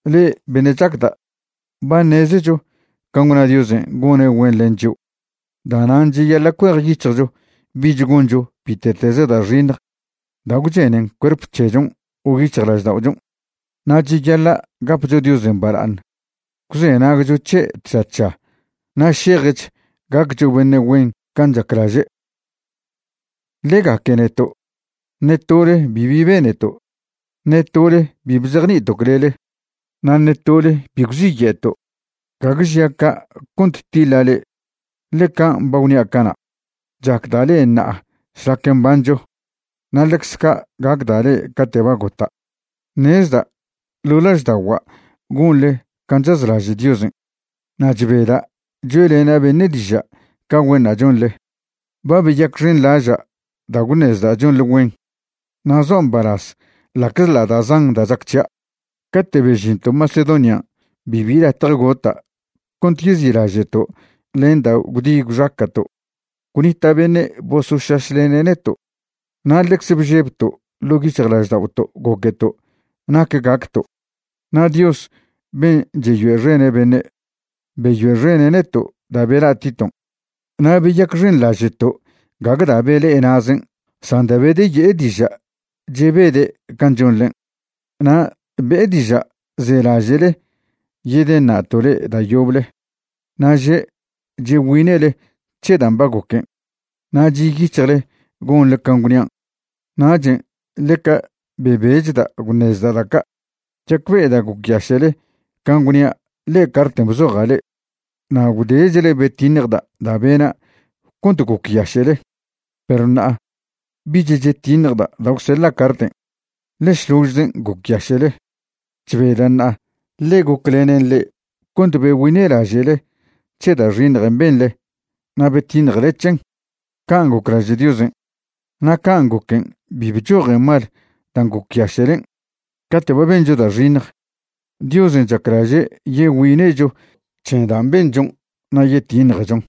Le'e beṉe' chacda', ba ṉezecho can' gwna Diosen' gone' güen len chio'. Da'nan' cheyaḻa' cuejyic̱hjcho bich goncho bite'teze da' xiṉj da' gwchenen cuerp c̱hechon' o yic̱hjlažda'ochon'. Na' cheyaḻa' gapcho Diosen' bala'aṉ gwzenagcho c̱he' tža tža na' šejch gaccho beṉe' güen can' chaclaže'. Ḻe gaque neto'. Ṉe tole bibi beneto'. Ṉe tole bi bzejni'ito' clele, na' ṉe tole bi gwziye'to'. Gague žia' ca' cont tiḻa' le'e, ḻe can' ba gwnia' cana', chacda' le'e ṉa'a šlac mbancho na' ḻecz ca' gacda' le'e cate' ba gota'. Ṉezda' ḻo' lažda'ogua' gonḻe can' chazlaže' Diosen', na' chbeda' choe'lena' beṉe' diža' ca güenṉa' chonḻe. Ba beyacxenḻaža' da' gwṉezda' chonḻe güen, na' zoa' mbalaz ḻa'czḻa' da' zan da' chac c̱hia'. Cate' bežinto' Macedonian' bibi latje gota' cont yezi'laže'to' len da' gwdi gwxaca'to'. Gwnita' beṉe' bosošašlene' neto' na' ḻecze bžebto' ḻo' yic̱hjlažda'oto' goqueto' nac gacto'. Na' Dios ben' cheyoe'xene' beṉe', beyoe'xene' neto' da' bela' Titon'. Na' beyacxenḻaže'to' gague da' bele'e na'zen' san da' bedeye'e diža' chebede' can' chonḻen'. Na' be'e diža' zelaže'le yedeṉa'to' le'e da' yoble. Na' že' chegüine'le c̱he dan' ba goquen' na' chi' yic̱hjle gonḻe can' gwnian'. Nachen' ḻeca bebechda' gwṉezda' da' ca'. Chacbe'eda' gocyaše'le can' gwnia' ḻe'e carten' bzoja' le'e. Na' gwdechle betiṉjda' da' bena' cont gocyaše'le, perw ṉa'a bich chetiṉjda' da' gwseḻa' carten', ḻe šložzen' gocyaše'le. Chbeda' ṉa'a, ḻe goclenen le'e cont begüine'laže'le c̱he da' xiṉjen' benḻe na' betiṉjele c̱hen, can' goclaže' Diosen'. Na' can' goquen' bi bchojen mal dan' gocyaše'len'. Cate' ba bencho da' xiṉj, Diosen' chaclaže' yegüine'cho c̱he dan' benchon' na' yetiṉjechon.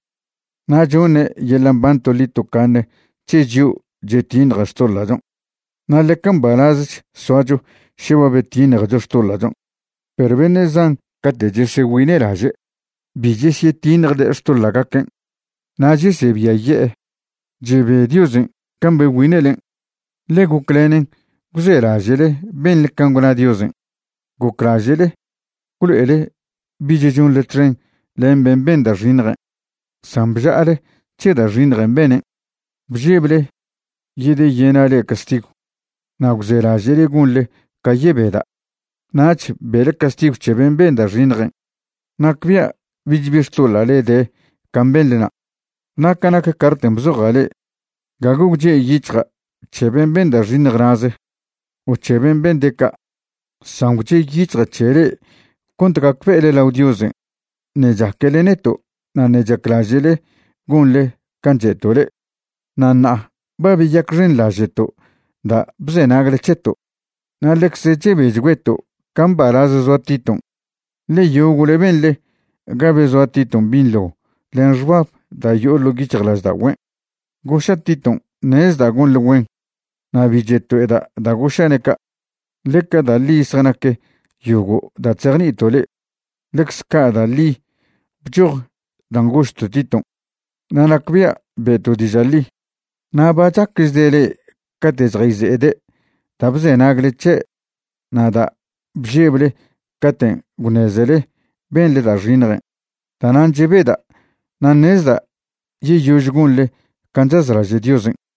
Na' choṉe' yeḻa' mban toḻi tocaṉe c̱he chio' chetiṉje xtoḻa'chon', na' ḻeca mbalazch soacho še ba betiṉjecho xtoḻa'chon'. Perw beṉe' zan cate' chesegüine'laže' bi chesyetiṉjde' xtoḻa'gaquen', nach yesebiaye'e. Chebe Diosen' can' begüine'len', ḻe goclenen gwzelaže'le benḻe can' gwna Diosen'. Goclaže'le gwlo'ele bich chonḻe txen len ben' ben da' xiṉjen', san bža'ale c̱he da' xiṉjen' benen'. Bžeble yedeyena' le'e castigw na' gwzelaže'le gonḻe ca yebeda'. Nach be'le castigw c̱he ben' ben da' xiṉjen'. Nacbia' bich bi xtoḻa'le de can' benḻna'. Na' ca nac carten' bzoja' le'e, gague gwche' yic̱hja' c̱he ben' ben da' xiṉj na'ze, o c̱he ben' bende' ca', san gwche' yic̱hja' c̱he le'e cont gacbe'ele lao Diosen' ṉe' chaquele neto' na' ṉe' chaclaže'le gonḻe can' che'to' le'e. Na' ṉa'a ba beyacxenḻaže'to' da' bzenagle c̱heto'. Na' ḻecze chebechgüeto' ca mbalaz zoa Titon', ḻe yogo'le benḻe ga bezoa Titon' binḻo len xbab da' yo'o ḻo' yic̱hjlažda'ogüen'. Goša' Titon' ṉezda' gonḻe güen. Na' bi cheto'eda' da' goša'ne' ca', ḻe ca da' ḻi zjanac yogo' da' chzejni'ito' le'e, ḻecz ca' da' ḻi bchoj dan' gožto' Titon', na' nacbia' be'to' diža' ḻi. Na' ba chacchde' le'e cate' chjayze'ede' da' bzenagle c̱he' na' da' bžeble caten' gwṉezele benḻe da' xiṉjen'. Da'nan' chebeda' na' ṉezda' yeyož gonḻe can' chazlaže' Diosen'.